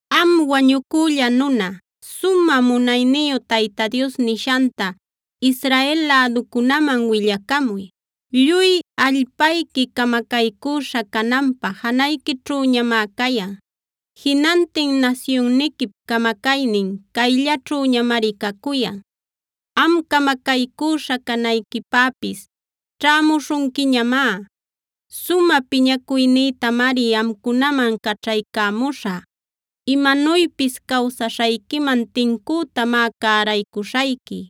“Am wañucülla nuna, sumä munayniyu Tayta Dios nishanta Israel läducunäman willacamuy: “ ‘Lluy allpayqui camacaycüśha cananpä janayquićhüñamá cayan. Jinantin nasyunniquip camacaynin cayllaćhüñamari cacuyan. Am camacaycüśha canayquipäpis ćhämuśhunquiñamá. Sumä piñacuynïtamari amcunaman caćhaycämuśhä. Imanuypis cawsaśhayquiman tincütamá cäraycuśhayqui;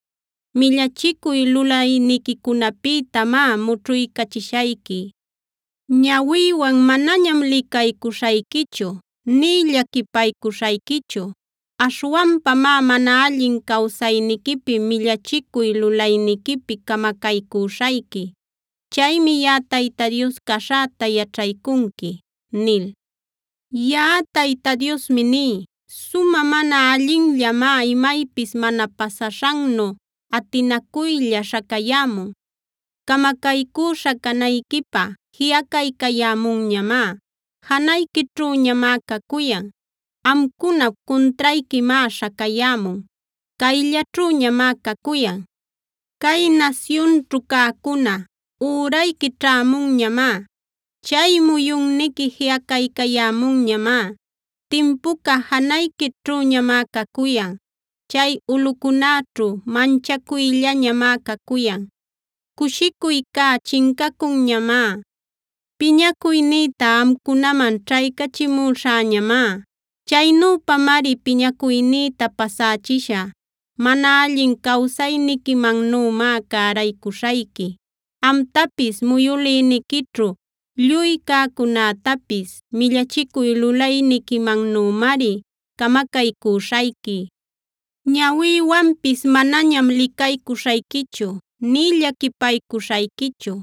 millachicuy lulayniquicunapïtamá mućhuycachishayqui. Ñawïwan manañam licaycuśhayquichu nï llaquipaycuśhayquichu. Aśhwanpamá mana allin cawsayniquipi, millachicuy lulayniquipi camacaycüśhayqui. Chaymi yaꞌa Tayta Dios caśhäta yaćhaycunqui’ nil. “Yaꞌa Tayta Diosmi ní: “¡Sumä mana allinllamá imaypis mana pasaśhannu atinacuylla śhacayämun! ¡Camacaycüśha canayquipä jiꞌacaycayämunñamá; janayquićhüñamá cacuyan! ¡Amcunap cuntrayquimá śhacayämun; cayllaćhüñamá cacuyan! Cay nasyunćhu cäcuna, ürayqui ćhämunñamá. Chay muyunniqui jiꞌacaycayämunñamá. Timpuca janayquićhüñamá cacuyan. Chay ulꞌucunäćhu manchacuyllañamá cacuyan; cushicuycá chincacunñamá. Piñacuynïta amcunaman ćhaycachimuśhäñamá. Chaynüpamari piñacuynïta pasächishä. Mana allin cawsayniquimannümá cäraycuśhayqui; amtapis muyüliniquićhu lluy cäcunätapis millachicuy lulayniquimannümari camacaycüśhayqui. Ñawïwanpis manañam licaycuśhayquichu nï llaquipaycuśhayquichu.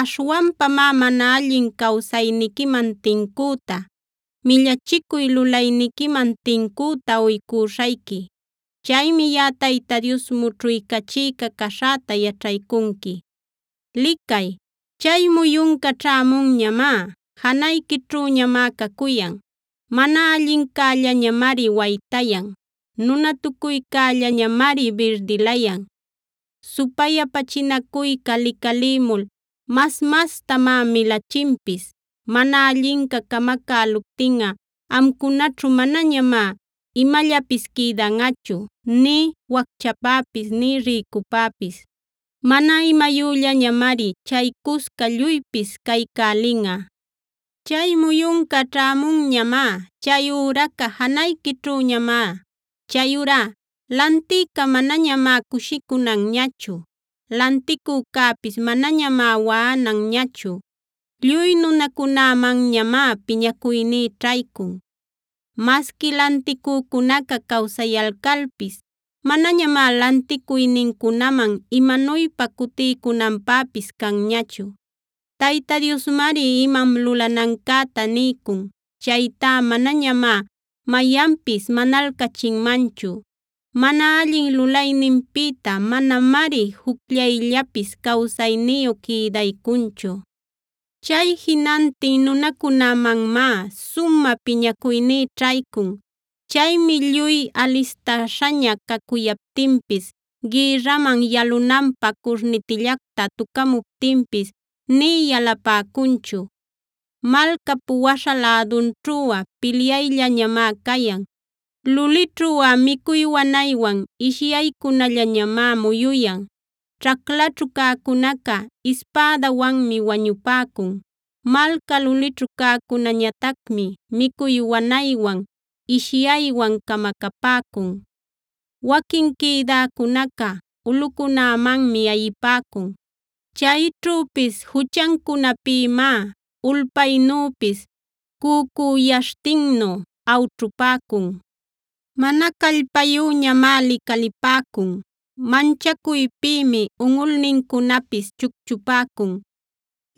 Aśhwanpamá mana allin cawsayniquiman tincüta, millachicuy lulayniquiman tincüta uycüśhayqui. Chaymi yaꞌa Tayta Dios mućhuycachïca caśhäta yaćhaycunqui. “¡Licay! Chay muyunca ćhämunñamá; janayquićhüñamá cacuyan. Mana allincällañamari waytayan; nunatucuycällañamari birdilayan. Supayapachinacuyca licalïmul mas-mastamá milachinpis. Mana allinca camacäluptinꞌa amcunaćhu manañamá imallapis quïdanꞌachu, nï wacchäpapis nï rïcüpapis. Mana imayüllañamari chaycusca lluypis caycälinꞌa. Chay muyunca ćhämunñamá; chay üraca janayquićhüñamá. Chayurá lantïca manañamá cushicunanñachu; lanticücäpis manañamá waꞌananñachu. Lluy nunacunämanñamá piñacuyní ćhaycun. Masqui lanticücunaca cawsayalcalpis manañamá lanticuynincunaman imanuypa cutiycunanpäpis canñachu. Tayta Diosmari imam lulanancäta niycun. Chaytá manañamá mayanpis manalcachinmanchu. Mana allin lulayninpïta manamari jucllayllapis cawsayniyu quïdaycunchu. “Chay jinantin nunacunämanmá sumä piñacuyní ćhaycun. Chaymi lluy alistäśhaña cacuyaptinpis, gïrraman yalunanpä curnitillacta tucamuptinpis nï yalapäcunchu. Malcap waśha lädunćhuꞌa pilyallañamá cayan; lulićhuꞌa micuy wanaywan ishyaycunallañamá muyuyan. Ćhaclaćhu cäcunaca ispädawanmi wañupäcun; malca lulićhu cäcunäñatacmi micuy wanaywan ishyaywan camacapäcun. Waquin quïdäcunaca ulꞌucunämanmi ayipäcun. Chayćhüpis juchancunapïmá ulpaynüpis cücüyaśhtinnu awćhupäcun. Mana callpayüñamá licalipäcun; manchacuypïmi unꞌulnincunapis chucchupäcun.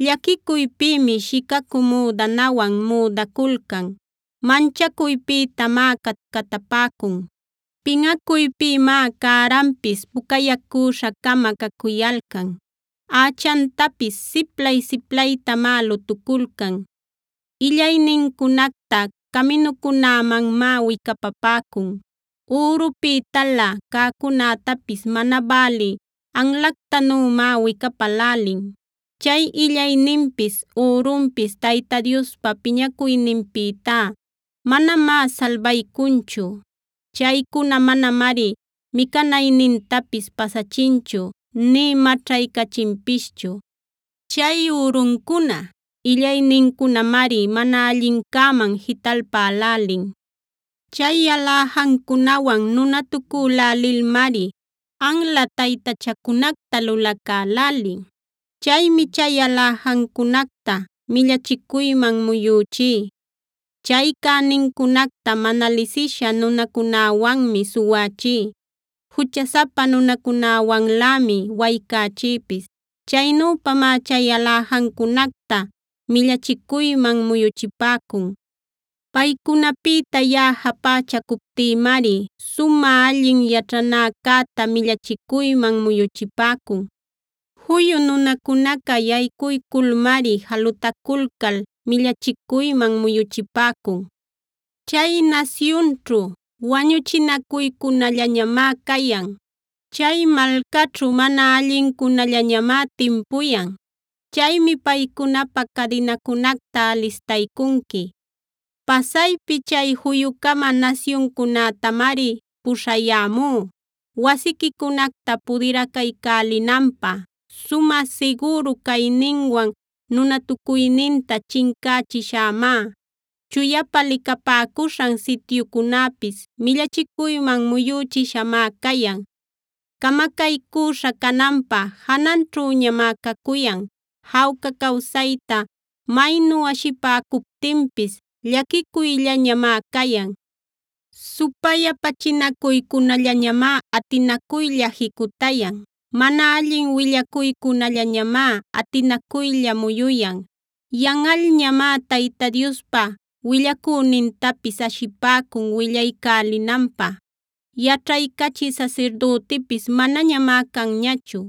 Llaquicuypïmi shicacü müdanawan müdaculcan. Manchacuypïtamá catcatapäcun; pinꞌacuypïmá cärapis pucayacüśha-cama cacuyalcan; ächantapis siplay-siplaytamá lutuculcan. “Illaynincunacta caminucunämanmá wicapapäcun; ürupïtalä cäcunätapis mana bälï anlactanümá wicapälälin. Chay illayninpis ürunpis Tayta Diospa piñacuyninpïtá manamá salbaycunchu. Chaycuna manamari micanaynintapis pasachinchu nï maćhaycachinpischu. Chay üruncuna, illaynincunamari mana allincäman jitalpälälin. Chay aläjancunawan nunatucülälilmari anla taytachacunacta lulacälälin. Chaymi chay aläjancunacta millachicuyman muyüchí. Chay cänincunacta mana lisisha nunacunäwanmi suwächí. Juchasapa nunacunawanlämi waycächïpis. Chaynüpamá chay aläjancunacta millachicuyman muyuchipäcun. Paycunapïta yaꞌa japächacuptïmari sumä allin yaćhanäcäta millachicuyman muyuchipäcun. Juyu nunacunaca yaycuyculmari jalutaculcal millachicuyman muyuchipäcun. “Chay nasyunćhu wañuchinacuycunallañamá cayan; chay malcaćhu mana allincunallañamá timpuyan. Chaymi paycunapä cadinacunacta alistaycunqui. Pasaypi chay juyu-cama nasyuncunätamari puśhayämú wasiquicunacta pudiracaycälinanpä. Sumä sigüru cayninwan nunatucuyninta chincächiśhämá; chuyapa licapäcuśhan sityucunäpis millachicuyman muyüchishamá cayan. Camacaycüśha cananpä jananćhüñamá cacuyan. Jawca cawsayta maynu ashipäcuptinpis llaquicuyllañamá cayan. Supayapachinacuycunallañamá atinacuylla jicutayan; mana allin willacuycunallañamá atinacuylla muyuyan. Yanꞌalñamá Tayta Diospa willacünintapis ashipäcun willaycälinanpä. Yaćhaycachï sasirdütipis manañamá canñachu;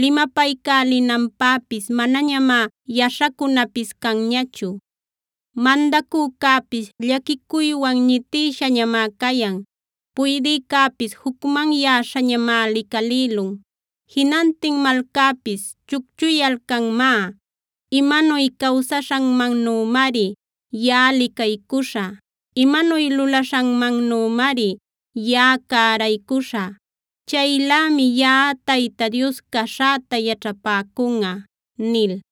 limapaycälinanpäpis manañamá yaśhacunäpis canñachu. Mandacücäpis llaquicuywan ñitïshañamá cayan; puydïcäpis jucmanyäśhañamáa licalïlun; jinantin malcäpis chucchuyalcanmá. Imanuy cawsaśhanmannümari yaꞌa licaycuśhä; imanuy lulaśhanmannümari yaꞌa cäraycuśhä. Chaylämi yaꞌa Tayta Dios caśhäta yaćhapäcunꞌa” nil.